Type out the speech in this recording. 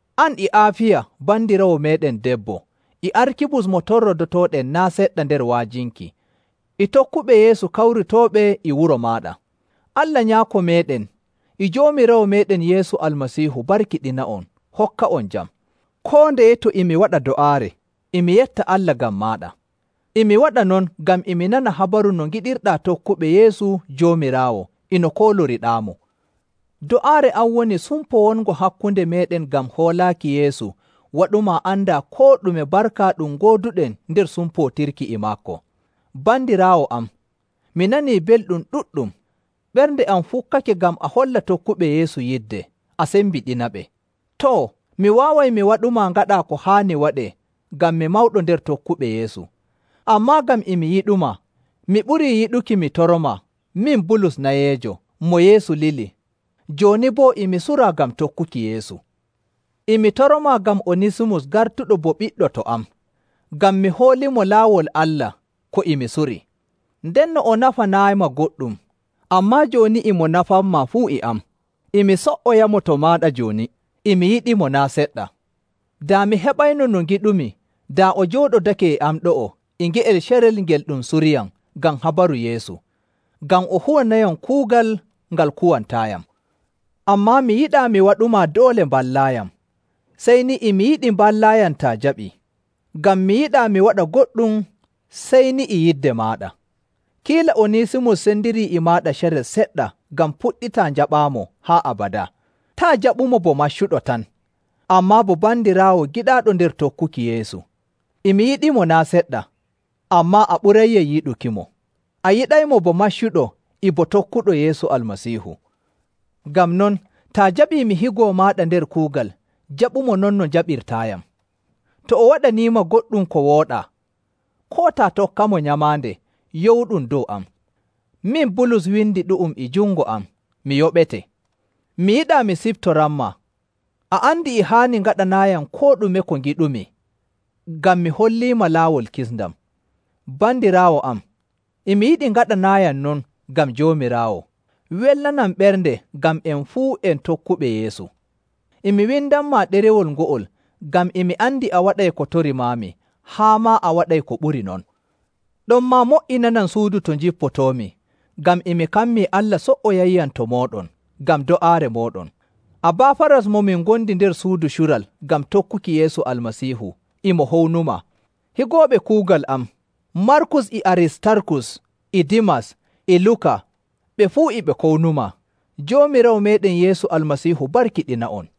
an e Aafiya bandiraawo meeɗen debbo, e Arkibus mo torrodotooɗen naa' seɗɗa nder wa'ajinki, e tokkuɓe Yeesu kawritooɓe e wuro maaɗa. Allah, Nyaako meeɗen, e Joomiraawo meeɗen Yeesu Almasiihu barkiɗina'on hokka'on jam. Koo ndeye to e mi waɗa do'aare, e mi yetta Allah ngam maaɗa. E mi waɗa non ngam e mi nana habaru no ngiɗirɗaa tokkuɓe Yeesu Joomiraawo e no kooloriɗaamo. Do'aare am woni sumpo wongo hakkunde meeɗen ngam hoolaaki Yeesu waɗumaa andaa koo ɗume barka ɗum ngooduɗen nder sumpootirki e maako. Bandiraawo am, mi nanii belɗum ɗuɗɗum. Ɓernde am fukkake ngam a holla tokkuɓe Yeesu yidde, a sembiɗinaɓe. Too, mi waaway mi waɗumaa ngaɗaa ko haani waɗee ngam mi mawɗo nder tokkuɓe Yeesu. Ammaa ngam e mi yiɗumaa, mi ɓurii yiɗuki mi toromaa, min Bulus nayeejo, mo Yeesu lili, jooni boo e mi suraa ngam tokkuki Yeesu. E mi toromaa ngam Onisimus gartuɗo bo ɓiɗɗo to am, ngam mi holliimo laawol Allah ko e mi surii. Ndenno o nafanaayima goɗɗum, ammaa jooni e mo nafanmaa fuu e am. E mi so''oyamo to maaɗa jooni, e mi yiɗimo naa' seɗɗa. Daa mi heɓayno no ngiɗumi daa o jooɗodake e am ɗo'o e nge'el carel ngel ɗum suriyam ngam habaru Yeesu, ngam o huwanayam kuugal ngal kuwantaayam. Ammaa mi yiɗaa mi waɗumaa doole mballaayam, sey ni e mi yiɗi mballaayam taa jaɓii. Ngam mi yiɗaa mi waɗa goɗɗum sey ni e yidde maaɗa. Kiila Onisimus sendirii e maaɗa carel seɗɗa ngam puɗɗitaa njaɓaamo haa abadaa. Taa' jaɓumo bo maccuɗo tan, ammaa bo bandiraawo giɗaaɗo nder tokkuki Yeesu. E mi yiɗimo naa' seɗɗa, ammaa a ɓurayyam yiɗukimo. A yiɗaymo bo maccuɗo e bo tokkuɗo Yeesu Almasiihu. Ngam non, taa jaɓii mi higo maaɗa nder kuugal, jaɓumo non no njaɓirtaayam. To o waɗaniima goɗɗum ko wooɗaa, koo taa tokkamo nyamaande, yowuɗum dow am. Min Bulus windi ɗu'um e jungo am, mi yoɓete. Mi yiɗaa mi siftoranmaa, a andi e haani ngaɗanaayam koo ɗume ko ngiɗumi ngam mi holliima laawol kisndam. Bandiraawo am, e mi yiɗi ngaɗanaayam non ngam Joomiraawo. Welnanam ɓernde ngam en fuu en tokkuɓe Yeesu. E mi windanmaa ɗerewol ngo'ol ngam e mi andi a waɗay ko torimaami haa maa a waɗay ko ɓuri non. Ɗonmaa mo''inanam suudu to njippotoomi, ngam e mi kammii Allah so''oyayyam to mooɗon ngam do'aare mooɗon. Abaafaras mo min ngondi nder suudu cural ngam tokkuki Yeesu Almasiihu, e mo hownumaa. Higooɓe kuugal am, Markus e Aristarkus e Dimas e Luka ɓe fuu e ɓe kownumaa. Joomiraawo meeɗen Yeesu Almasiihu barkiɗina'on.